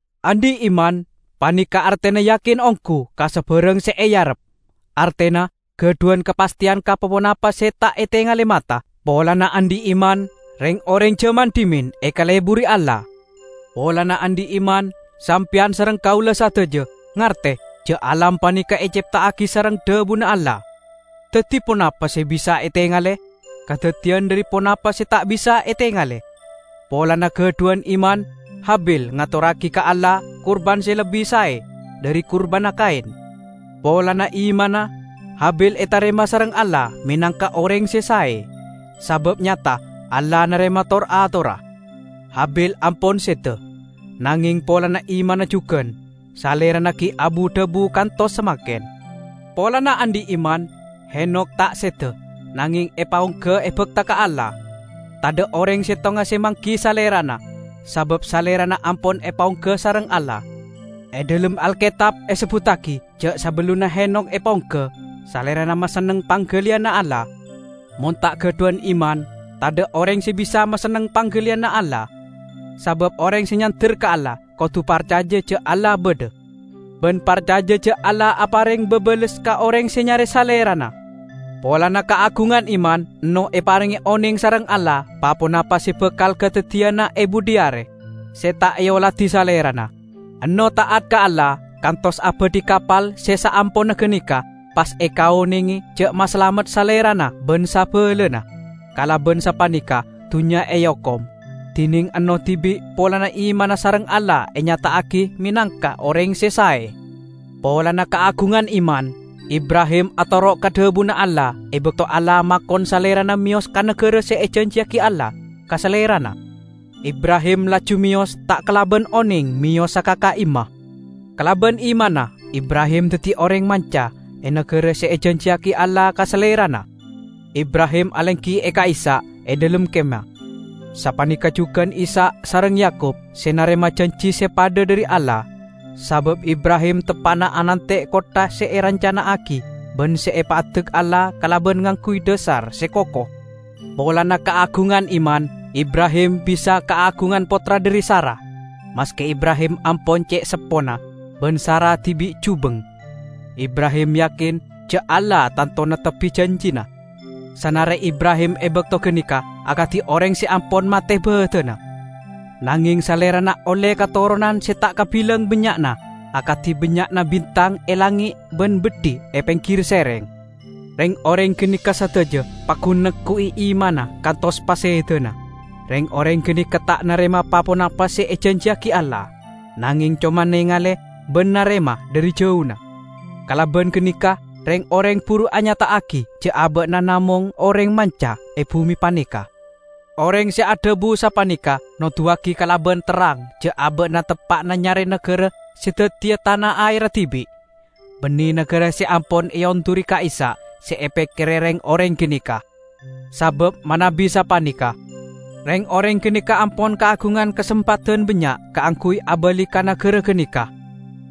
Andhi' iman paneka artena yakin onggu ka sabarang se earep, artena gadhuwan kapastheyan ka pa-ponapa se ta' etengale mata. Polana andhi' iman, reng-oreng jaman dhimen ekaleburi Allah. Polana andhi' iman, sampeyan sareng kaula sadaja ngarte ja' alam paneka ecepta'agi sareng dhabuna Allah; daddi, ponapa se bisa etengale, kadaddiyan dhari ponapa se ta' bisa etengale. Polana gadhuwan iman, Habil ngatorragi ka Allah kurban se lebbi sae dhari kurbanna Kain. Polana imanna, Habil etarema sareng Allah menangka oreng se sae, sabab nyata Allah narema tor-atorra. Habil ampon seda, nangeng polana imanna jugan, salerana gi' abu-dhabu kantos samangken. Polana andhi' iman, Henokh ta' seda, nangeng epaongga ebakta ka Allah. Tadha' oreng settonga se manggi salerana, sabab salerana ampon epaongga sareng Allah. E dhalem Alketab esebbuttagi ja' sabellunna Henokh epaongga, salerana masenneng panggaliyanna Allah. Mon ta' gadhuwan iman, tadha' oreng se bisa masenneng panggaliyanna Allah. Sabab oreng se nyander ka Allah kodu parcaja ja' Allah badha, ban parcaja ja' Allah apareng babales ka oreng se nyare Salerana. Polana kaagungan iman, Ennoh eparenge oneng sareng Allah pa-ponapa se bakal kadaddiyana e budhi are, se ta' eoladi salerana. Ennoh ta'at ka Allah kantos abadhi kapal se saamponna ganeka pas ekaonenge ja' masalamet salerana ban sabalana. Kalaban sapaneka dunnya eokom, dineng Ennoh dibi' polana imanna sareng Allah enyata'agi menangka oreng se sae. Polana kaagungan iman, Ibrahim atoro' ka dhabuna Allah e bakto Allah makon salerana meyos ka nagara se ejanjiyagi Allah ka salerana. Ibrahim laju meyos ta' kalaban oneng meyosa ka ka'imma. Kalaban imanna Ibrahim daddi oreng manca e nagara se ejanjiyagi Allah ka salerana. Ibrahim alenggi e ka'issa' e dhalem kemah. Sapaneka jugan Ishak sareng Yakub se narema janji se padha dhari Allah. Sabab Ibrahim teppa'na anante' kottha se erancana'agi ban se epaddek Allah kalaban ngangguy dhasar se koko. Polana kaagungan iman, Ibrahim bisa kaagungan pottra dhari Sara, maske Ibrahim ampon ce' seppona ban Sara dibi' jubeng. Ibrahim yakin ja' Allah tanto neptebbi janjina. Sanare Ibrahim e bakto ganeka akadi oreng se ampon mate badanna, nangeng salerana olle katoronan se ta' kabilang bannya'na -- akadi bannya'na bintang e langnge' ban beddhi e penggir sereng. Reng-oreng ganeka sadaja paggun neggu'i imanna kantos pasedana. Reng-oreng ganeka ta' narema pa-ponapa se ejanjiyagi Allah, nangeng coma nengale ban narema dhari jauna. Kalaban ganeka reng-oreng buru anyata'agi ja' aba'na namong oreng manca e bume paneka. Oreng se adhabu sapaneka noduwagi kalaban terrang ja' aba'na teppa'na nyare nagara se daddiya tana aerra dibi'. Banne nagara se ampon eonduri ka'issa' se epekkere reng-oreng ganeka. Sabab manabi sapaneka, reng-oreng ganeka ampon kaagungan kasempadan bannya' kaangguy abali ka nagara ganeka.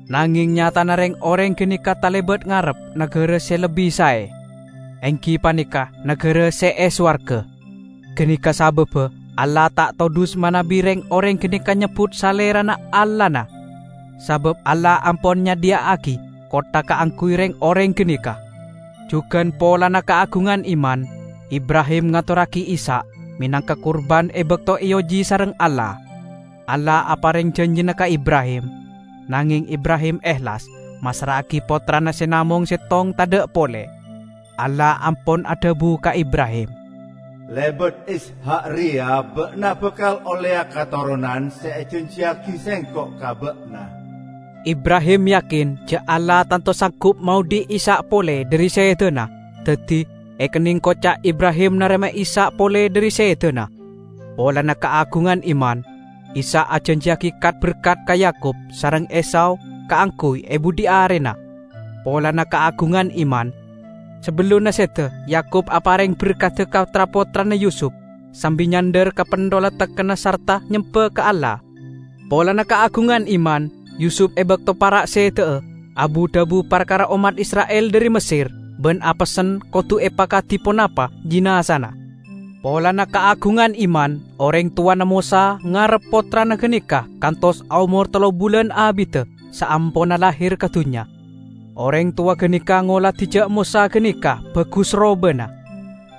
Nangeng nyatana reng-oreng ganeka talebat ngarep nagara se lebbi sae, enggi paneka nagara se e sowarga. Ganeka sababba Allah ta' todhus manabi reng-oreng ganeka nyebbut Salerana Allahna, sabab Allah ampon nyadhiya'agi kottha kaangguy reng-oreng ganeka. Jugan polana kaagungan iman Ibrahim ngatorragi Ishak menangka kurban e bakto eoji sareng Allah. Allah apareng janjina ka Ibrahim, nangeng Ibrahim ehlas massra'agi pottrana se namong settong tadha' pole. Allah ampon adhabu ka Ibrahim, "Lebat Ishak reya ba'na bakal olleya katoronan se ejanjiyagi Sengko' ka ba'na." Ibrahim yakin ja' Allah tanto sanggup maodhi' Ishak pole dhari sedana -- daddi, ekenneng koca' Ibrahim narema Ishak pole dhari sedana. Polana kaagungan iman, Ishak ajanjiyagi kat-berkat ka Yakub sareng Esau kaangguy e budhi arena. Polana kaagungan iman, sabellunna seda Yakub apareng berkadda ka tra-pottrana Yusup -- sambi nyandhar ka pentholla tekkenna sarta nyemba ka Allah. Polana kaagungan iman, Yusup -- e bakto para' seda'a -- abu-dhabu parkara ommat Isra'il dhari Messer ban apessen kodu epakadi ponapa jinazana. Polana kaagungan iman oreng towana Mosa ngerrep pottrana ganeka kantos aomor tello bulan abidda saamponna lahir ka dunnya. Oreng towa ganeka ngoladi ja' Mosa ganeka bagus robana,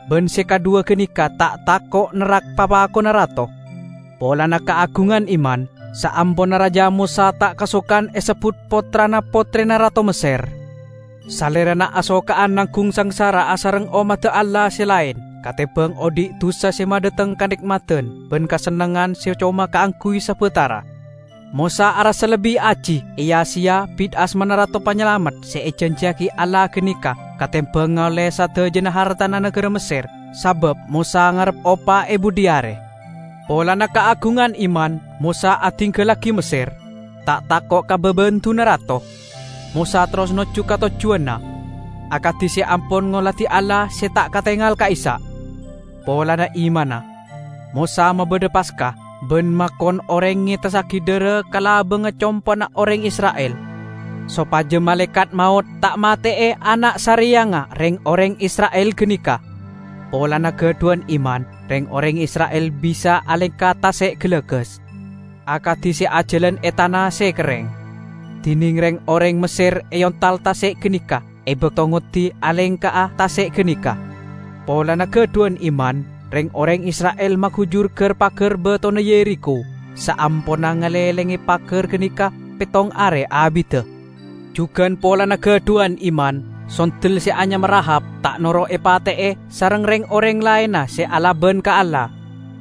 ban se kadhuwa ganeka ta' tako' nerrak papakonna rato. Polana kaagungan iman, saamponna raja Mosa ta' kasokan esebbut pottrana pottrena rato Messer. Salerana asoka'an nanggung sangsara asareng ommadda Allah se laen katembang odhi' dusa se madhateng kane'madan ban kasennengngan se coma kaangguy sabatara. Mosa arassa lebbi aji eya-seya bit asmana Rato Panyalamet se ejanjiyagi Allah ganeka katembang ngaolle sadajana hartana nagara Messer sabab Mosa ngarep opa e budhi are. Polana kaagungan iman Mosa adinggallagi Messer, ta' tako' ka babendunna rato. Mosa terros nojju ka tojjuwanna, akadi se ampon ngoladi Allah se ta' katengal ka'issa'. Polana imanna, Mosa mabadha Paska ban makon oreng ngetessagi dhara ka labangnga compo'na oreng Isra'il sopaja Malaekat Maot ta' mate'e ana' sareyangnga reng-oreng Isra'il ganeka. Polana gadhuwan iman reng-oreng Isra'il bisa alengka Tase' Galagas, akadi se ajalan e tana se kerreng, dineng reng-oreng Messer eontal tase' ganeka e bakto ngoddi alengka'a tase' ganeka. Polana gadhuwan iman reng-oreng Isra'il magujur gar-pagar batona Yerikho saamponna ngalenglenge pagar ganeka pettong are abidda. Jugan polana gadhuwan iman, sondel se anyama Rahab ta' noro' epate'e sareng reng-oreng laenna se alaban ka Allah,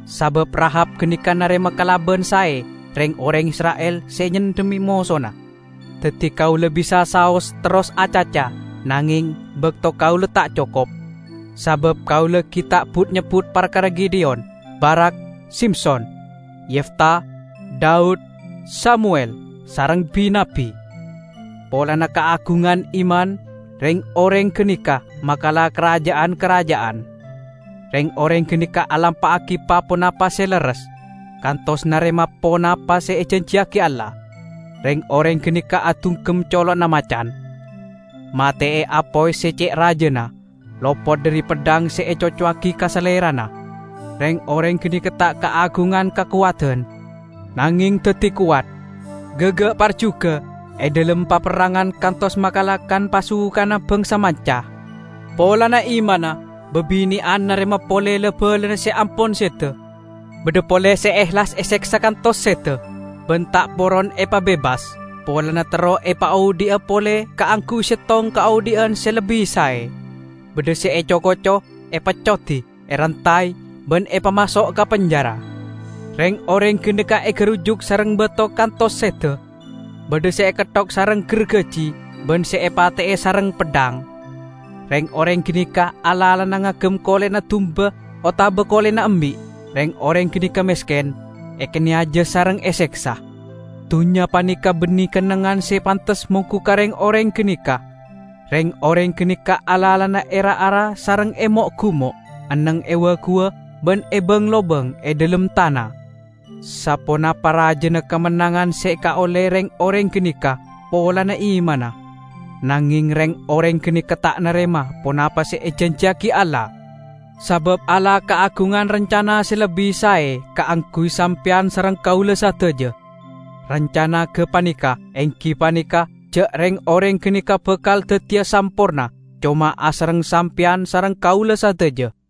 sabab Rahab ganeka narema kalaban sae reng-oreng Isra'il se nyendhemme mosona. Daddi kaula bisa saos terros acaca, nangeng bakto kaula ta' cokop. Sabab kaula gi' ta' but-nyebbut parkara Gideyon, Barak, Simson, Yefta, Daud, Samuwel sareng bi-nabbi. Polana kaagungan iman, reng-oreng ganeka makala karaja'an-karaja'an. Reng-oreng ganeka alampa'agi pa-ponapa se lerres, kantos narema ponapa se ejanjiyagi Allah. Reng-oreng ganeka adunggem colo'na macan, mate'e apoy se ce' rajana, lopot dhari peddhang se ecocowagi ka salerana. Reng-oreng ganeka ta' kaagungan kakowadan, nangeng daddi kowat; gaga' parjuga e dhalem paperrangan kantos makala kan-pasukanna bangsa manca. Polana imanna, babine'an narema pole la-balana se ampon seda. Badha pole se ehlas eseksa kantos seda, ban ta' poron epabebas, polana terro epaodhi'a pole kaangguy settong kaodhi'an se lebbi sae. Badha se eco-koco, epeccodi, erantay ban epamaso' ka penjara. Reng-oreng ganeka egarujuk sareng bato kantos seda, badha se eketthok sareng gargaji ban se epate'e sareng peddhang. Reng-oreng ganeka alalana ngagem kole'na dumba otaba kole'na embi'; reng-oreng ganeka mesken, ekaneyaja sareng eseksa. Dunnya paneka banne kennengngan se pantes monggu ka reng-oreng ganeka. Reng-oreng ganeka alalana e ra-ara sareng e mo'-gumo', enneng e wa-guwa ban e bang-lobang e dhalem tana. Saponapa rajana kamennangan se ekaolle reng-oreng ganeka polana imanna! Nangeng reng-oreng ganeka ta' narema ponapa se ejanjiyagi Allah, sabab Allah kaagungan rancana se lebbi sae kaangguy sampeyan sareng kaula sadaja. Rancana gapaneka enggi paneka ja' reng-oreng ganeka bakal daddiya samporna coma asareng sampeyan sareng kaula sadaja.